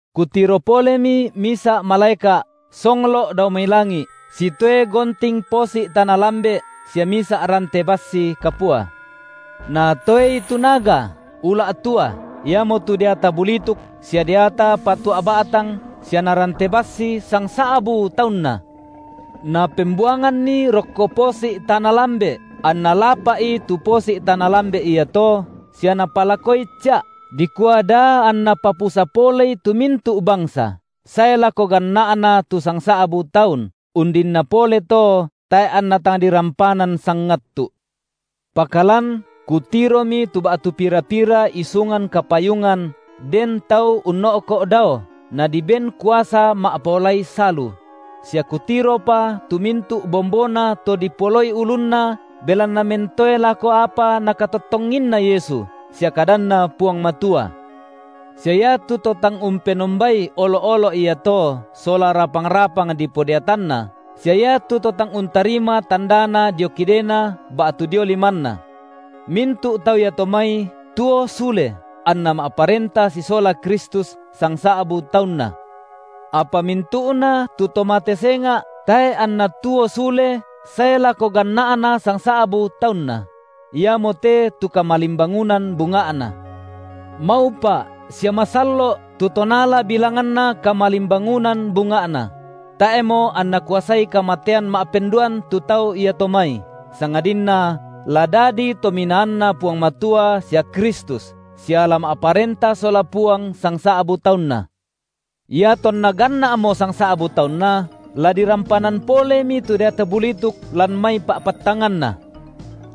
Kutiro polemi misa’ malaeka’ songlo’ dao mai langi’ sitoe gonting posi’ tana lambe’ sia misa’ rante bassi kapua, natoei tu naga, ula’ tua, iamotu deata bulituk sia deata patua’ ba’tang sia narante bassi sangsa’bu taunna, napembuanganni rokko posi’ tana lambe’, anna lapa’i tu posi’ tana lambe’ iato, sia napalakoi ca’, dikua da anna papusa polei tu mintu’ bangsa, sae lako ganna’na tu sangsa’bu taun, undinna pole to tae’ anna tang dirampanan sangattu’. Pakalan kutiromi tu ba’tu pira-pira isungan kapayungan den tau unno’ko’ dao, nadiben kuasa ma’paolai salu; sia kutiropa tu mintu’ bombona to dipoloi ulunna belanna mentoe lako apa Nakatottonginna Yesu sia kadanNa Puang Matua, sia iatu to tang umpenombai olo’-olo’ iato sola rapang-rapang dipodeatanna, sia iatu to tang untarima tandana dio kidena ba’tu dio limanna. Mintu’ tau iato mai tuo sule anna ma’parenta sisola Kristus sangsa’bu taunna. Apa mintu’na tu to mate senga’ tae’ anna tuo sule sae lako ganna’na sangsa’bu taunna; iamote tu kamalimbangunan bunga’na. Maupa’ sia masallo’ tu to naala bilanganna kamalimbangunan bunga’na; tae’mo anna kuasai kamatean ma’penduan tu tau iato mai, sangadinna la dadi tominaanNa Puang Matua sia Kristus, sia la ma’parenta sola Puang sangsa’bu taunna. Iatonna ganna’mo sangsa’bu taunna, la dirampanan polemi tu deata bulituk lan mai pa’pattanganna,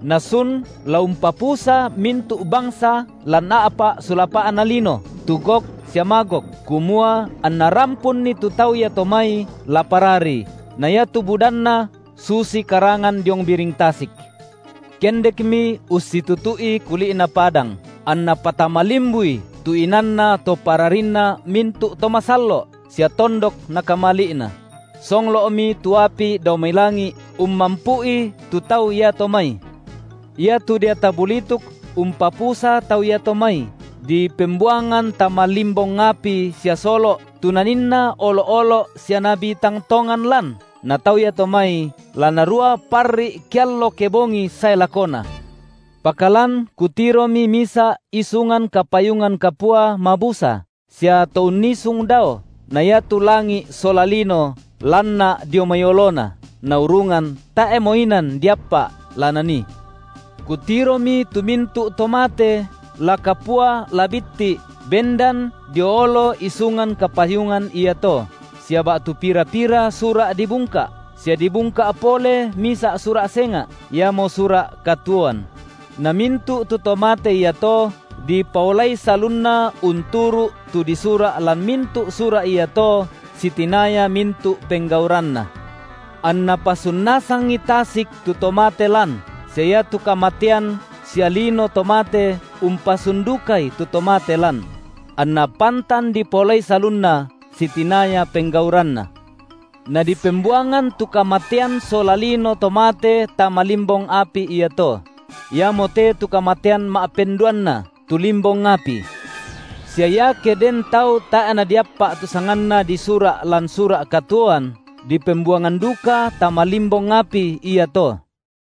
nasun la umpapusa mintu’ bangsa lan a’pa’ sulapa’na lino, tu Gog sia Magog, kumua anna rampunni tu tau iato mai la parari, na iatu budanna susi karangan diong biring tasik. Kendekmi ussitutu’i kuli’na padang, anna patama limbui tu inanna to pararinna mintu’ to masallo’ sia tondok Nakamali’na; songlo’mi tu api dao mai langi’ ummampu’i tu tau iato mai. Iatu deata bulituk umpapusa tau iato mai, dipembuangan tama limbong api sia solo’, tu naninna olo’-olo’ sia nabi tang tongan lan, na tau iato mai, la narua parri’ keallo kebongi sae lakona. Pakalan kutiromi misa’ isungan kapayungan kapua mabusa, sia To unnisung dao, na iatu langi’ sola lino lanna’ dio mai oloNa, naurungan tae’mo inan diappa’ la nanii. Kutiromi tu mintu’ to mate, la kapua, la bitti’ bendan dio olo isungan kapayungan iato, sia ba’tu pira-pira sura’ dibungka’, sia dibungka’ pole misa’ sura’ senga’, iamo sura’ katuoan; na mintu’ tu to mate iato, dipaolai salunna unturu’ tu disura’ lan mintu’ sura’ iato sitinaya mintu’ penggauranna. Anna pasun nasangi tasik tu to mate lan, sia iatu kamatean sia lino to mate umpasun dukai tu to mate lan; anna pantan dipaolai salunna sitinaya penggauranna. Nadipembuangan tu kamatean sola lino to mate tama limbong api iato; iamote tu kamatean ma’penduanna: tu limbong api. Sia iake den tau tae’ nadiappa’ tu sanganna disura’ lan sura’ katuoan, dipembuangan duka tama limbong api iato.